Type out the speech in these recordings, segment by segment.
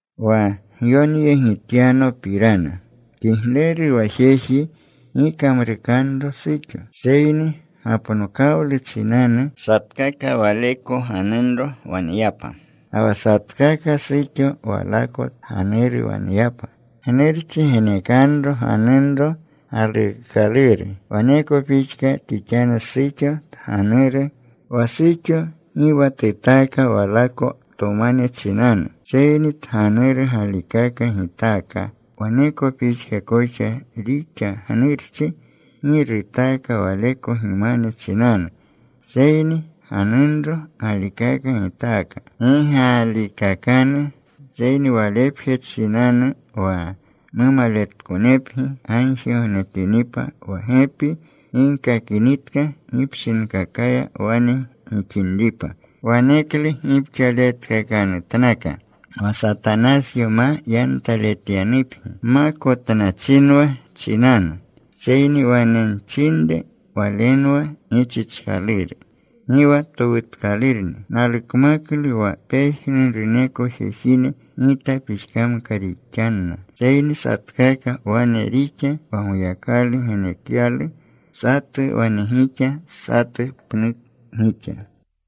Wa gyonyegityanopirana, kigleru wa jeji gi kamrukanro suxo. Seyni gapnokawlu chinanu satkaka waleko ganunro waneyapa. Ga wa satkaka suxo walako tganuru waneyapa. Gnurchi genekanro ganunro galuukaluru. Waneko pixka tixanru suxo tganuru. Wa suxo gi wa tutaaka walako tomane chinanu, seyni tganuru galikaka gitaaka. Waneko pixka koxa rixa gnurchi. Gi rutaaka waleko gimane chinanu, seyni ganunro galikaka gitaaka. Gi gaalikakanu, seyni walepje chinanu wa mumaletkonepgi gagjigognetinripa wa gepi gigkakinitka gipshinkakaya wane gixinripa. Waneklu gipxaletkakanutnaka, wa Satanasyo ma yantaletyanupgi gmakotnachinwa chinanu. Seyni wane nchinre walenwa gichichkaluru. Gi wa towutkalurni. Nalukmaklu wa pejnuruneko jejine gita pixkamka rixanna. Seyni satkaka wane rixa wa Goyakalu genekyalu. Satu wane gixa. Satu pnu gixa.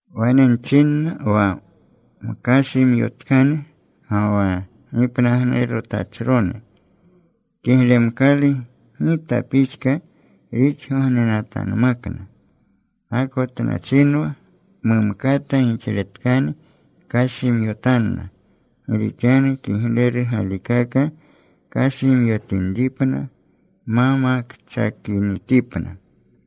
Wane nchinna wa mkashimyotkane ga wa gipnagnurutachrone, kiglemkalu gita pixka rixgognenatanmakna. Gakotnachinwa mumkata gixletkane kashimyotanna. Gi rixanu kigleru galikaka kashimyotinripna ma makchakinitipna.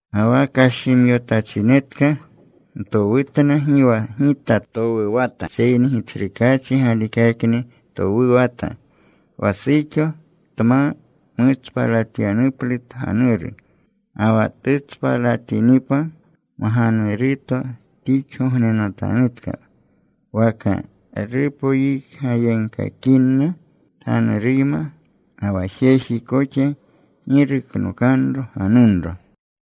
Ga wa kashimyotachinetka ntowutna, gi wa gita towuwata seyni Gitsrukaachi galikakni towuwata, wa suxo tma mutspalatyanuplu tganuru. Ga wa tutspalatinipa, mganuruto tixgognenatanutka, waka rupoyikgayegkakinna tganuruyma. Ga wa jeji koxa gi ruknokanro ganunro.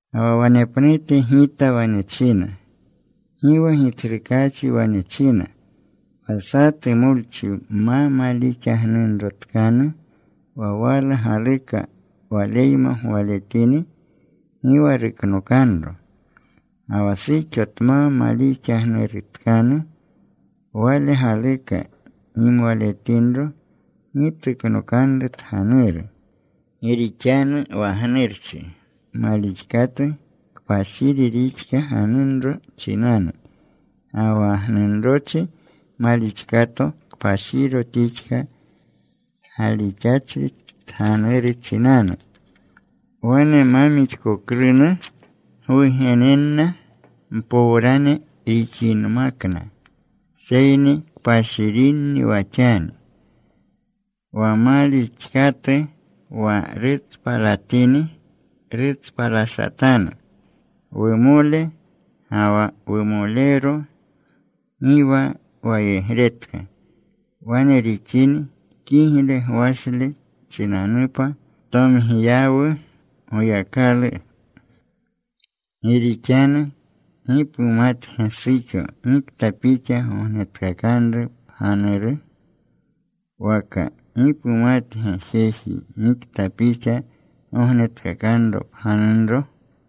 Ga wa wanepnute gita wane china, gi wa Gitsrukaachi wane china: wa satu molchi ma malixagnunrotkanu wa wala galuka waleyma gwaletini, gi wa ruknokanro. Ga wa suxo tma malixagnurutkanu, wale galuka gimwaletinro, gi tuknokanru tganuru. Gi rixanu wa gnurchi malixkatu kpashiri rixka ganunro chinanu. Ga wa gnunrochi malixkato kpashiro tixka galixachri tganuru chinanu. Wane ma mixkoklunu gwugenenna mpowrane rixinmakna. Seyni kpashirinni wa xani. Wa malixkatu wa rutspalatini, rutspalashatanu. Wumole ga wa wumolero gi wa wayegretka wane rixini. Kigle gwashle chinanupa tomgiyawu Goyakalu. Gi rixanu ¿gi pumatge, suxo, gikta pixa gognetkakanru pganuru? Waka ¿gi pumatge, jeji, gikta pixa gognetkakanro pganunro?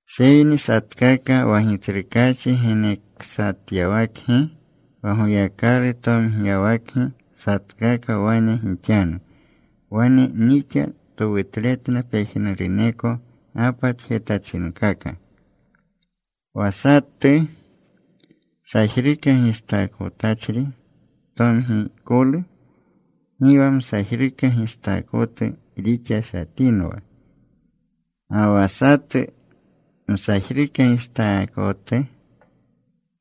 Seyni satkaka wa Gitsrukaachi geneksatyawakgi, wa Goyakalu tomgiyawakgi satkaka, wane gixanu. Wane nixa towutletna pejnuruneko gapatjetachinkaka. ¿Wa satu sajruka gistaakotachri tomgikolu? Gi wa msajruka gistaakotu rixashatinwa. ¿Ga wa satu msajruka gistaakotu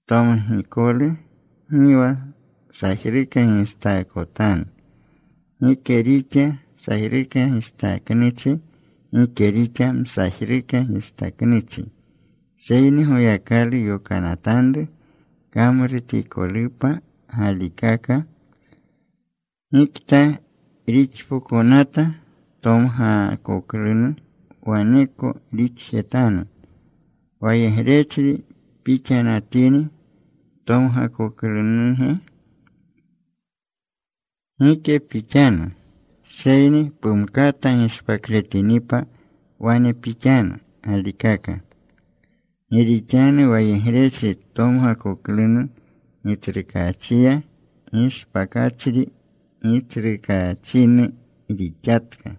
tomgikolu? Gi wa sajruka gistaakotanu. Gike rixa sajruka gistaknuchi. Gike rixa msajruka gistaknuchi, seyni Goyakalu yokanatanru kamrutikolupa galikaka. Gikta rixpokonata tomgakoklunu, waneko rixjetanu. ¿Wayegrechri pixanatini ptomgakoklunuge? Gike pixanu, seyni pumkata gishpakletinipa wane pixanu galikaka. Gi rixanu wayegrechri tomgakoklunu Gitsrukaachiya, gishpakachri Gitsrukaachinu rixatka.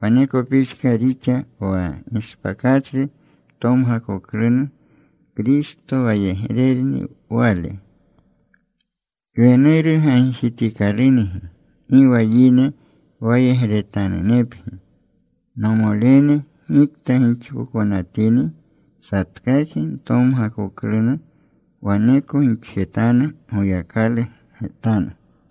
Waneko pixka rixa wa gishpakachri tomgakoklunu. Kristo wayegrerni wale. Kwenuru gagjitikalungi. Gi wa yine wayegretanunepgi. Nomolene, gikta gixpokonatini satkakgi ntomgakoklunu, waneko gixjetanu Goyakalu getanu.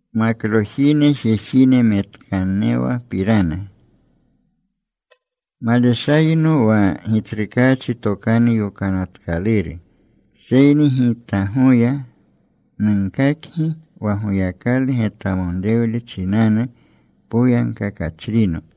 Maklojine jejine metkanewapirana, maleshayno wa Gitsrukaachi tokanu yokanatkaluru, seyni gitgoya nunkakgi wa Goyakalu getwamonrewle chinanu poyagkakachrino.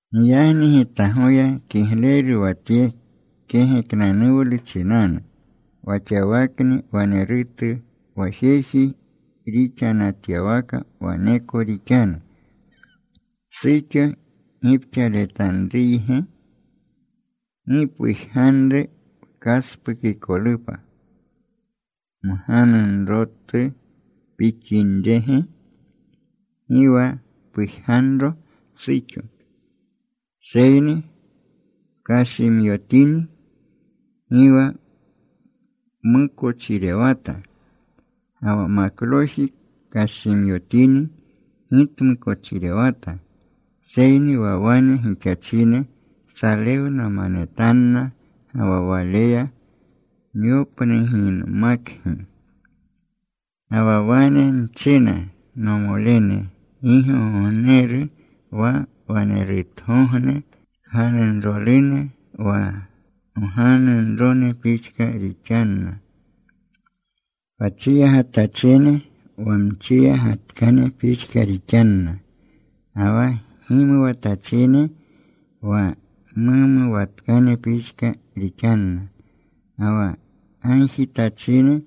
Giyagni gitgoya kigleru wa tye kegeknanuwlu chinanu wa xawakni wanerutu wa jeji rixanatyawaka waneko rixanu. ¿Suxo gipxaletanruyge? Gi pujganru pkaspukikolupa. ¿Mganunrotu pixinrege? Gi wa pujganro suxo. Seyni pkashimyotini, gi wa pmukochirewata. Ga wa makloji kashimyotini gi tmukochirewata. Seyni wa wane gixachine salewnamanetanna. Ga wa waleya nyopnuginmakgi. Ga wa wane nchina, nomolene. Gi gogogneru. Wa wanerutuwagogne kganunrolune wa mganunrone pixka rixanna. Wa chiyagatachine wa mchiyagatkane pixka rixanna. Ga wa gimuwatachine wa mumuwatkane pixka rixanna. Ga wa gagjitachine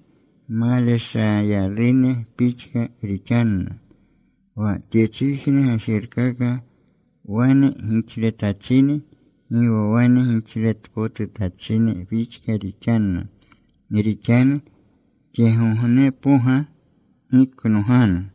maleshayalune pixka rixanna. Wa tyechijne gajerkaka wane gixletachine, gi wa wane gixletpotutachine pixka rixanna. Gi rixanu tyegognepoga giknoganu.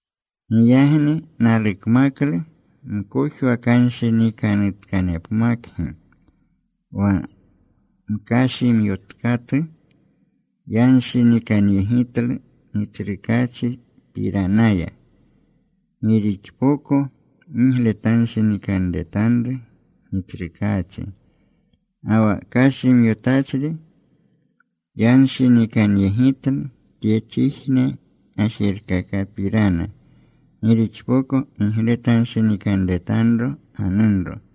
Giyagni nalukmaklu mkojwakanshinikanutkanepmakgi. Wa mkashimyotkatu yanshinikanyegitlu Gitsrukaachipiranaya, gi rixpoko gigletanshinikanretanru Gitsrukaachi. Ga wa kashimyotachri yanshinikanyegitlu tyechijne gajerkakapirana, gi rixpoko gigletanshinikanretanro ganunro.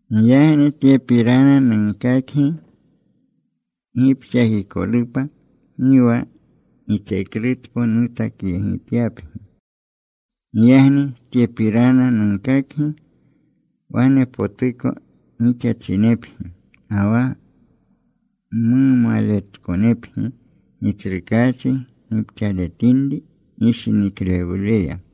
Giyagni tyepirana nunkakgi gipxakikolupa, gi wa gitseklutpo nutakyegityapgi. Giyagni tyepirana nunkakgi, wanepotuko gixachinepgi ga wa mumaletkonepgi Gitsrukaachi gipxaletinri gishiniklewleya.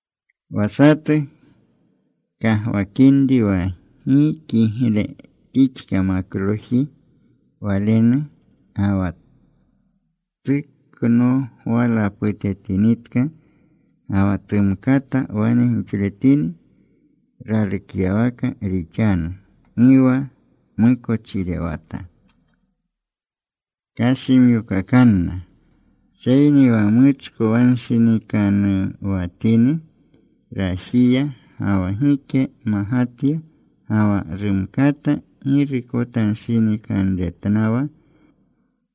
Wa satu kagwakinri wa gi kigle tixka makloji walenu, ga wa tuknogwalaputetinitka, ga wa tumkata wane gixletini, ralukyawaka rixanu. Gi wa mukochirewata. Kashimyokakanna. Seyni wa muchkowanshinikanuwatini rajiya, ga wa gike magatya, ga wa rumkata girukotanshinikanretnawa,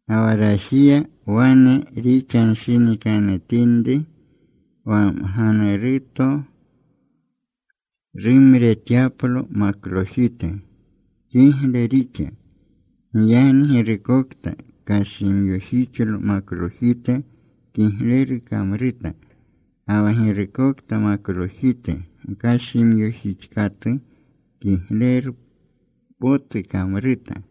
ga wa rajiya wane rixanshinikanutinri wa mganuruto rumretyaplo maklojite, kigle rixa. Giyagni girukokta kashimyojixlo maklojite kigleru kamruta. Ga wa girukokta maklojite mkashimyojixkatu kigleru potu kamruta.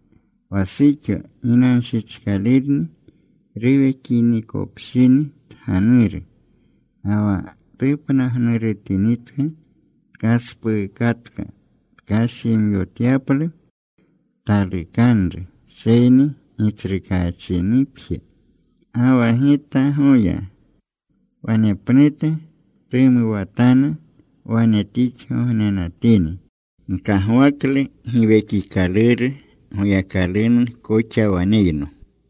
Wa suxo ginanshichkalurni ruwekinikopshini tganuru. Ga wa tupnagnurutinitka tkaspuukatka tkashimyotyaplu talukanru, seyni Gitsrukaachinupje. Ga wa gitgoya wanepnute tumuwatanu wane tixgognenatini. Nkagwaklu Giwekikaluru Goyakalunu koxa waneyno.